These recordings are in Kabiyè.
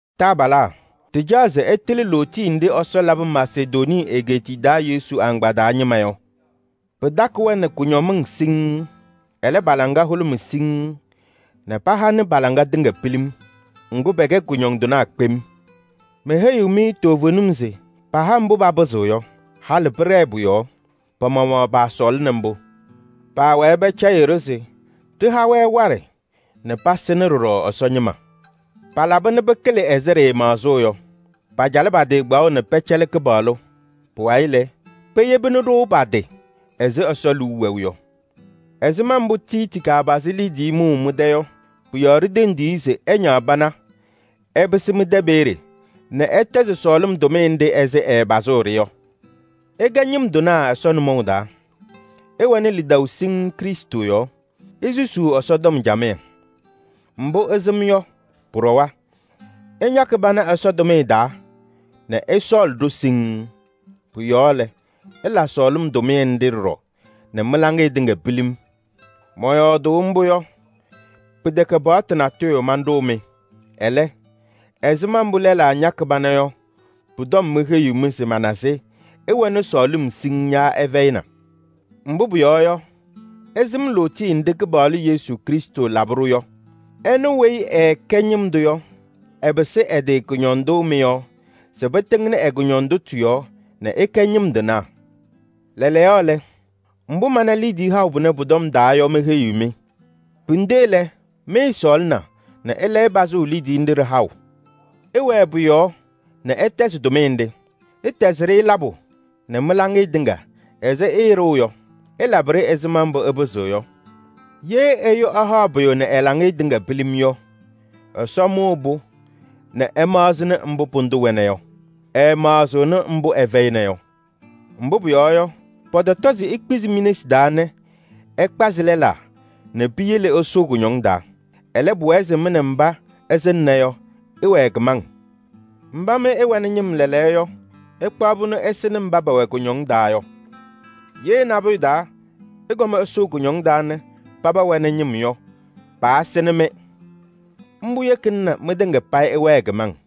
Taabalaa, ɖɩcaɣ se ɩtɩlɩ lootiye nɖɩ Ɛsɔ labɩ Masedonii egeetiye taa Yesu agbaa taa ñɩma yɔ. Pɩtakɩ-wɛ nɛ kʋñɔmɩŋ siŋŋ, ɛlɛ, pa-laŋa hʋlʋmɩ siŋŋ nɛ pahanɩ pa-laŋa tɩŋa pilim. Ŋgʋ, pɛkɛ kʋñɔndɩnaa kpem. Meheyiɣ-mɩ toovenim se paha mbʋ papɩzɩɣ yɔ. Halɩ pɩɖɛɛ pʋ-yɔɔ. Pa-maɣmaɣ paasɔɔlɩnɩ mbʋ. Paawɛɛ pɛcɛyɩɣ-ɖʋ se ɖɩha-wɛ waɖɛ nɛ pasɩnɩ ɖɔɖɔ Ɛsɔ ñɩma. Palaba nɛ pɩkɩlɩ ɛzɩ ɖɩɩmaɣzʋʋ yɔ: pacalɩ pa-tɩ kpaɣʋ nɛ pɛcɛlɩ Kɩpaɣlʋ. Pʋwayɩ lɛ, peyebini-ɖʋ pa-tɩ ɛzɩ Ɛsɔ liu wɛʋ yɔ. Ɛzɩma mbʋ Tiiti kapazɩ liidiye mʋʋ mɩ-tɛ yɔ, pʋ-yɔɔ ɖitendi-i se ɛñaɣ pana ɛpɩsɩ mɩ-tɛ peeye nɛ ɛtɛzɩ sɔɔlɩm tʋmɩyɛ nɖɩ ɛzɩ ɛɛpazʋʋ-ɖɩ yɔ. Ɩkɛ ñɩm tɩnaa Ɛsɔ nʋmɔʋ taa: ɩwɛnɩ lidaʋ siŋŋ Krɩstʋ yɔɔ, isusuu Ɛsɔtɔm camɩyɛ. Mbʋ ɩsɩm yɔ pʋɖɔwa, ɩñakɩ pana Ɛsɔ tʋmɩyɛ taa nɛ ɩsɔɔlɩ-ɖʋ siŋŋ. Pʋ-yɔɔ lɛ, ɩla sɔɔlɩm tʋmɩyɛ nɖɩ ɖɔɖɔ nɛ mɩ-laŋɩyɛ tɩŋa pilim. Mɔyɔɔdʋʋ mbʋ yɔ, pɩtɛkɛ paɣtʋ natʋyʋ manɖʋʋ-mɩ. Ɛlɛ, ɛzɩma mbʋ lɛlaa ñakɩ pana yɔ pʋ-tɔm meheyiɣ-mɩ se mana se ɩwɛnɩ sɔɔlɩm siŋŋ yaa ɩfɛyɩna. Mbʋ pʋyɔɔ yɔ, ɩsɩm lootiye nɖɩ Kɩpaɣlʋ Yesu Krɩstʋ labɩ-ɖʋ yɔ. Ɛnʋ weyi ɛɛkɛ ñɩm tʋ yɔ, ɛpɩsɩ ɛ-tɩ kʋñɔndʋ mɩ-yɔɔ se pɩtɩŋnɩ ɛ-kʋñɔndʋtʋ yɔɔ nɛ ɩkɛ ñɩm tɩnaa. Lɛɛlɛɛyɔ lɛ, mbʋ mana liidiye haʋ pʋnɛ pʋ-tɔm taa yɔ meheyiɣ-mɩ. Pinde lɛ, mɩɩsɔɔlɩna nɛ ɩlɛyɩ pazʋʋ liidiye nɖɩ ɖɩ-haʋ. Ɩwɛɛ pʋ-yɔɔ nɛ ɩtɛzɩ-ɖɩ. Ɩtɛzɩ-ɖɩ labʋ nɛ mɩ-laŋɩyɛ tɩŋa ɛzɩ ɩɩɖʋʋ yɔ. Ɩlabɩ-ɖɩ ɛzɩma mbʋ ɩpɩzɩɣ yɔ. Ye ɛyʋ ɛhaɣ pʋyʋ nɛ ɛ-laŋɩyɛ tɩŋa pilim yɔ, Ɛsɔ mʋʋ-pʋ nɛ ɛmaɣzɩnɩ mbʋ pʋdʋ wɛna yɔ. Ɛɛmaɣzɩɣnɩ mbʋ ɛfɛyɩna yɔ. Mbʋ pʋyɔɔ yɔ, pɔtɔtɔ se ikpizi mi-nesi taa nɛ ɩkpazɩ lɛlaa nɛ piyele ɩsʋʋ kʋñɔŋ taa. Ɛlɛ, pʋwɛɛ se mɩ nɛ mba ɩsɩŋna yɔ, ɩwɛɛ kɩmaŋ. Mba mɩ ɩwɛnɩ ñɩm lɛɛlɛɛyɔ yɔ, ɩkpaɣ-pʋ nɛ ɩsɩnɩ mba pɛwɛ kʋñɔŋ taa yɔ. Ye nabʋyʋ taa ɩkɔm ɩsʋʋ kʋñɔŋ taa nɛ mba wɛnɩ ñɩm yɔ, paasɩnɩ-mɩ. Mbʋ yekina nɛ mɩtɩŋa payɩ ɩwɛɛ kɩmaŋ.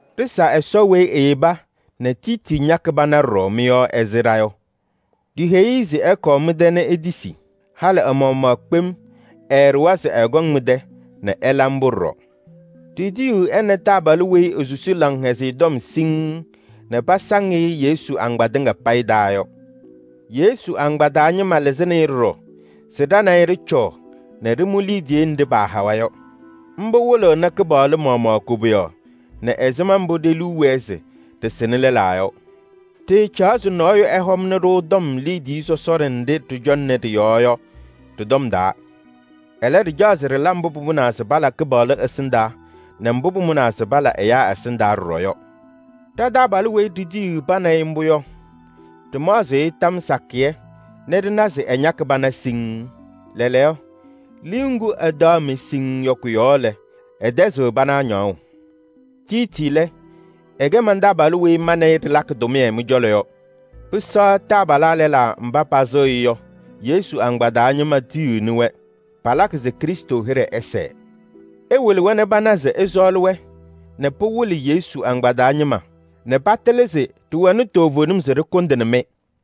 Ɖɩsa Ɛsɔ weyi eyeba nɛ Tiiti ñakɩ pana ɖɔɖɔ mɩ-yɔɔ ɛzɩ ɖa yɔ. Ɖiheyi-i se ɛkɔɔ mɩ-tɛ nɛ etisi. Halɩ ɛ-maɣmaɣ kpem ɛɛɖʋwa se ɛkɔŋ mɩ-tɛ nɛ ɛla mbʋ ɖɔɖɔ. Ɖitiyiɣ ɛ nɛ taabalʋ weyi esusi Laŋhɛzɩyɛ Tɔm siŋŋ nɛ pasaŋ-ɩ Yesu agbaa tɩŋa payɩ taa yɔ. Yesu agbaa taa ñɩma lɩzɩnɩ-ɩ ɖɔɖɔ se ɖa nɛ ɩ ɖɩcɔɔ nɛ ɖɩmʋ liidiye nɖɩ pahawa yɔ. Mbʋ wɩlɩɣnɩ Kɩpaɣlʋ maɣmaɣ koboyaɣ nɛ ɛzɩma mbʋ ɖe-liu wɛɛ se ɖɩsɩnɩ lɛlaa yɔ. Ɖɩɩcaɣ se nɔɔyʋ ɛhɔmnɩ-ɖʋ tɔm liidiye sɔsɔɖɛ nɖɩ ɖɩcɔŋnɩ ɖɩ-yɔɔ yɔ tɩ-tɔm taa. Ɛlɛ, ɖɩcaɣ se ɖɩla mbʋ pʋmʋnaa se pala Kɩpaɣlʋ ɛsɩndaa nɛ mbʋ pʋmʋnaa se pala ɛyaa ɛsɩndaa ɖɔɖɔ yɔ. Ɖa-taabalʋ weyi ɖitiyiɣ pa nɛ ɩ mbʋ yɔ, ɖɩmaɣzɩ-ɩ tɔm sakɩyɛ nɛ ɖɩna se ɛñakɩ pana siŋŋ. Lɛɛlɛɛyɔ, liu ŋgʋ ɛtaɣ-mɩ siŋŋ yɔ kʋ-yɔɔ lɛ, ɛtɛzɩɣ pana ñaɣʋ. Tiiti lɛ, ɛkɛ man-taabalʋ weyi ma nɛ ɩ ɖɩlakɩ tʋmɩyɛ mɩ-cɔlɔ yɔ. Pɩsɛɣ taabalaa lɛlaa mba pasɩɣ-ɩ yɔ, Yesu agbaa taa ñɩma tiyiɣni-wɛ. Palakɩ se Krɩstʋ hɩɖɛ ɛsɛɛ. Ɩwɩlɩ-wɛ nɛ pana se ɩsɔɔlɩ-wɛ nɛ pɩwɩlɩ Yesu agbaa taa ñɩma nɛ patɩlɩ se ɖɩwɛnɩ toovenim se ɖɩkʋndɩnɩ-mɩ.